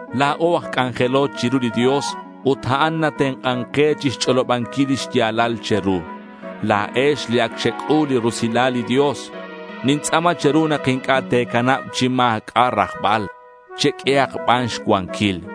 La̱o aj c'anjelo chiru li Dios ut a'an natenk'an ke chixch'olobanquil lix ya̱lal che̱ru. La̱ex li ac xec'ul li rusilal li Dios. Nintz'a̱ma che̱ru nak inc'a' te̱canab chi ma̱c'a' rajbal. Cheq'uehak ban xcuanquil.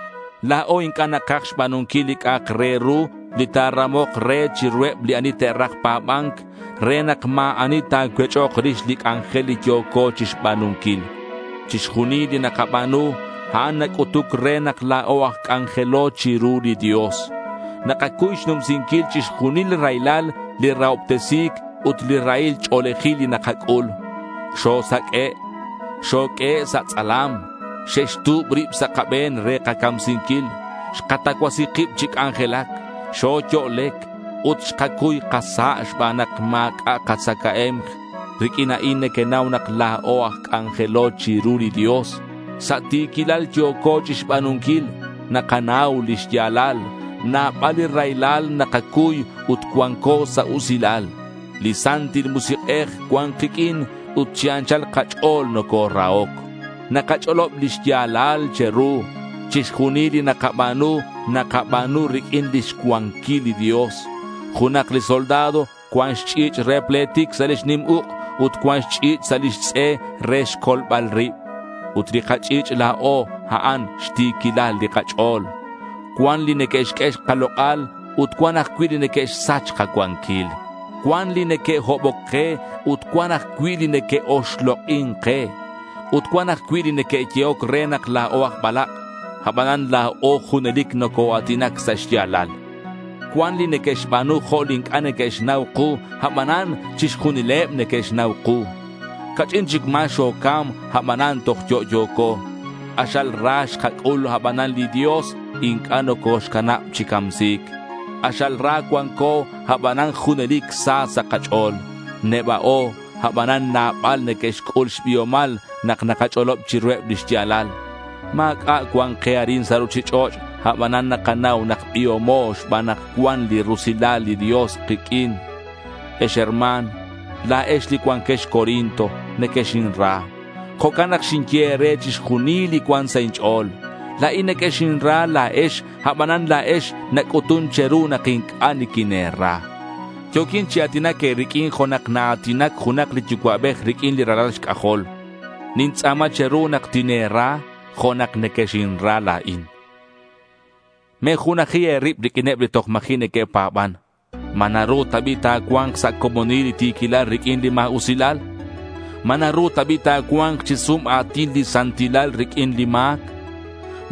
La̱o inc'a' nakaj xba̱nunquil li c'a'ak re ru li ta̱ramok re chiruheb li ani te'raj pa̱ba̱nc re nak ma̱ ani ta̱cuech'ok rix li c'anjel li yo̱co chixba̱nunquil. Chixjunil li nakaba̱nu, a'an nac'utuc re nak la̱o aj c'anjelo chiru li Dios. Nakacuy xnumsinquil chixjunil li raylal, li rahobtesi̱c ut li rahil ch'o̱lejil li nakac'ul. Xosaq'ue', xoq'uehe' sa' tz'alam, xe'xtu̱b rib sa' kabe̱n re kacamsinquil, xkatacuasi kib chi c'anjelac, xoyo'lec, ut xkacuy kasa' xban nak ma̱c'a' katzacae̱mk. Riq'uin a'in nequenau nak la̱o aj c'anjelo chiru li Dios. Sa' ti̱quilal yo̱co chixba̱nunquil. Nakanau li xya̱lal. Nabal li raylal nakacuy ut cuanco sa' usilal. Li Santil Musik'ej cuan kiq'uin ut chi anchal kach'o̱l nocorahoc. Nakach'olob li xya̱lal che̱ru. Chixjunil li nakaba̱nu, nakaba̱nu riq'uin lix cuanquil li Dios. Junak li soldado cuan xch'i̱ch' re pletic sa' lix nim uk' ut cuan xch'i̱ch' sa' lix tz'e re xcolbal rib. Ut li kach'i̱ch' la̱o, a'an xti̱quilal li kach'o̱l. Cuan li neque'xq'ue kalok'al ut cuan ajcui' li neque'xsach kacuanquil. Cuan li neque'hoboc ke ut cuan ajcui' li neque'oxlok'in ke. Ut cuan ajcui' li neque'yehoc re nak la̱o aj balak'. Abanan la̱o junelic nocoa̱tinac sa' xya̱lal. Cuan li neque'xba̱nu jo' li inc'a' neque'xnau ku, abanan chixjunileb neque'xnau ku. Ca'ch'in chic ma̱ xocam, abanan toj yo'yo̱co. K'axal ra xkac'ul abanan li Dios inc'a' nocoxcanab chi camsi̱c. K'axal ra cuanco, abanan junelic sa sa' kach'o̱l. Neba'o, abanan nabal neque'xc'ul xbiomal nak nakach'olob chiruheb li xya̱lal. Ma̱c'a' cuan ke arin sa' ruchich'och', abanan nakanau nak biomo xban nak cuan li rusilal li Dios kiq'uin. Ex herma̱n, la̱ex li cuanquex Corinto, nequexinra. Jo'can nak xinye e̱re chixjunil li cuan sa' inch'o̱l. La̱in nequexinra la̱ex, abanan la̱ex nac'utun che̱ru nak inc'a' niquine̱ra. Yo̱quin chi a̱tinac e̱riq'uin jo' nak naa̱tinac junak li yucua'bej riq'uin li ralal xc'ajol. Nintz'a̱ma che̱ru nak tine̱ra jo' nak nequexinra la̱in. Me̱junaji e̱rib riq'uineb li toj ma̱ji' neque'pa̱ban. ¿Ma naru ta bi' ta̱cua̱nk sa' comonil li ti̱quilal riq'uin li ma̱usilal? ¿Ma naru ta bi' ta̱cua̱nk chi sum a̱tin li santilal riq'uin li ma̱c?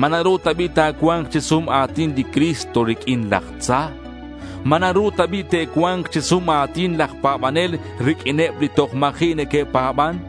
¿Ma naru ta bi' ta̱cua̱nk chi sum a̱tin li Cristo riq'uin laj tza? ¿Ma naru ta bi' te'cua̱nk chi sum a̱tin laj pa̱banel riq'uineb li toj ma̱ji' neque'pa̱ban?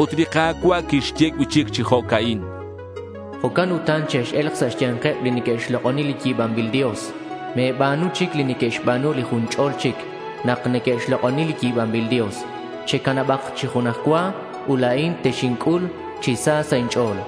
Ut li Ka̱cua' quixye cui'chic chi jo'ca'in: Jo'can utan chex-e̱lk sa' xya̱nkeb li neque'xlok'oni li yi̱banbil dios. Me̱ba̱nu chic li neque'xba̱nu li jun ch'ol chic nak neque'xlok'oni li yi̱banbil dios. Checanabak chi junaj cua ut la̱in texinc'ul chi sa sa' inch'o̱l.